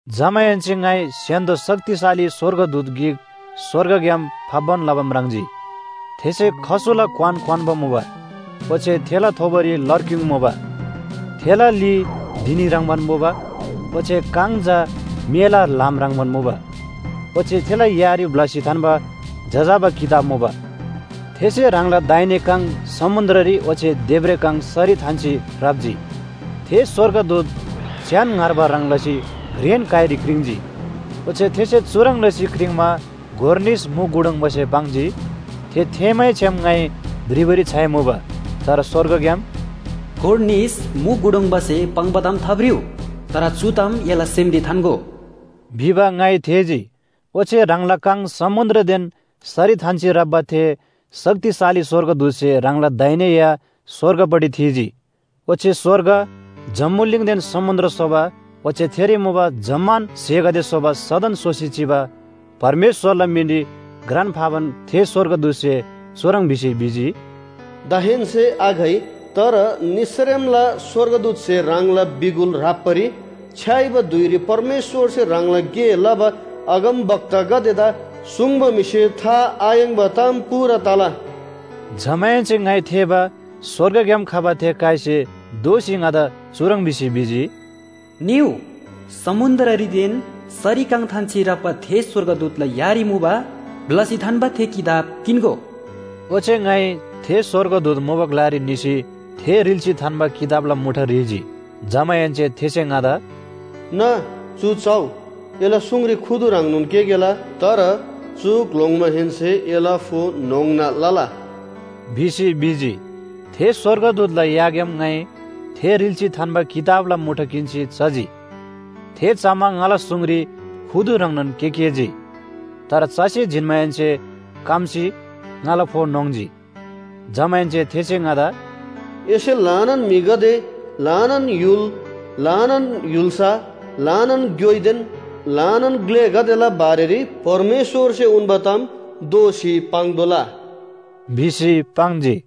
जमाहेन्‍से ङाइ स्‍य्‍हान्‍दो शक्तिशाली स्‍वर्गदूत गिक स्‍वर्गग्‍याम फाप्‍बान लबा म्राङ्जी। थेसे खसुला क्‍वान क्‍वान्‍बा मुबा, ओच्‍छे थेला थोबोरी लरक्‍युङ मुबा। थेला ली धिनी ह्रङ्‌बान मुबा, ओच्‍छे काङ चा मेला ल्‍हाम ह्रङ्‌बान मुबा। ओच्‍छे थेला यारी ब्‍लसी थान्‍बा जजाबा किताब मुबा। थेसे ह्राङला दाहिने काङ समुन्‍द्ररी ओच्‍छे देब्रे काङ सरी थान्‍सी राप्‍जी। थे स्‍वर्गदूत च्‍यान ङ्‍हार्बा ह्रङ् लसी घ्रेन काइरी क्रिङ्‌जी। ओच्‍छे थेसे चुह्रङ् लसी क्रिङ्‌मा गोर निस मु गुडुङबासे पाङ्जी। थे थेःमैछ्‌याम ङाइ भ्रिबारी छ्‌याइमुबा। तर स्‍वर्गग्‍याम “गोर निस मु गुडुङबासे पाङ्बा ताम थाभ्रिउ, तर चु ताम एला सेमरी थान्‍गो” भिबा ङाइ थेःजी। ओच्‍छे ह्राङला काङ समुन्‍द्रदेन सरी थान्‍सी राप्‍बा थे शक्तिशाली स्‍वर्गदूतसे ह्राङला दाहिने या स्‍वर्गपट्टि थीजी। ओच्‍छे स्‍वर्ग, जम्‍बुलिङदेन समुन्‍द्र स्‍होबा ओच्‍छे थेरी मुबा जम्‍मान स्‍हेगदे स्‍होबा सदन सोसी चिबा परमेश्‍वरला मिनरी घ्रान फाबान थे स्‍वर्गदूतसे चुह्रङ् भिसी भिजी, “दाहेन्‍से आघइ, तर निसरेमला स्‍वर्गदूतसे ह्राङला बिगुल ह्राप्‍बारी छ्‌याइबा धुइरी परमेश्‍वरसे ह्राङला गे लबा अगमवक्तागदेदा सुङ्बा म्‍हिसे था आयाङ्‍बा ताम पूरा तला।” जमाहेन्‍से ङाइ थेःबा स्‍वर्गग्‍याम खबा थे काइसे दोःसी ङादा चुह्रङ् भिसी भिजी, “निउ! समुन्‍द्ररीदेन सरी काङ थान्‍सी राप्‍बा थे स्‍वर्गदूतला यारी मुबा ब्‍लसी थान्‍बा थे किताब किन्‍गो।” ओच्‍छे ङाइ थे स्‍वर्गदूत मुबा ग्‍लारी निसी थे रिल्‍सी थान्‍बा किताबला मुठा ह्रीजी। जमाहेन्‍से थेसे ङादा “ना, चु चउ! एला सुङरी खुदु ह्रङ्नोन केकेला। तर चु ग्‍लोङ्‌माहेन्‍से एला फो न्‍होङ्ना लला” भिसी भिजी। थे स्‍वर्गदूतला याग्‍याम ङाइ थे रिल्‍सी थान्‍बा किताबला मुठा किन्‍सी चजी। थे चमा ङाला सुङरी खुदु ह्रङ्नोन केकेजी, तर चसी जिन्‍माहेन्‍से कम्‍सी ङाला फो न्‍होङ्जी। जमाहेन्‍से थेसे ङादा “एसे ल्‍हानान म्‍हिगदे, ल्‍हानान य्‍हुल, ल्‍हानान य्‍हुल्‍सा, ल्‍हानान ग्‍योइदेन ल्‍हानान ग्‍लेगदेला बारेरी परमेश्‍वरसे उन्‍बा ताम दोःसी पाङ्तोःला” भिसी पाङ्जी।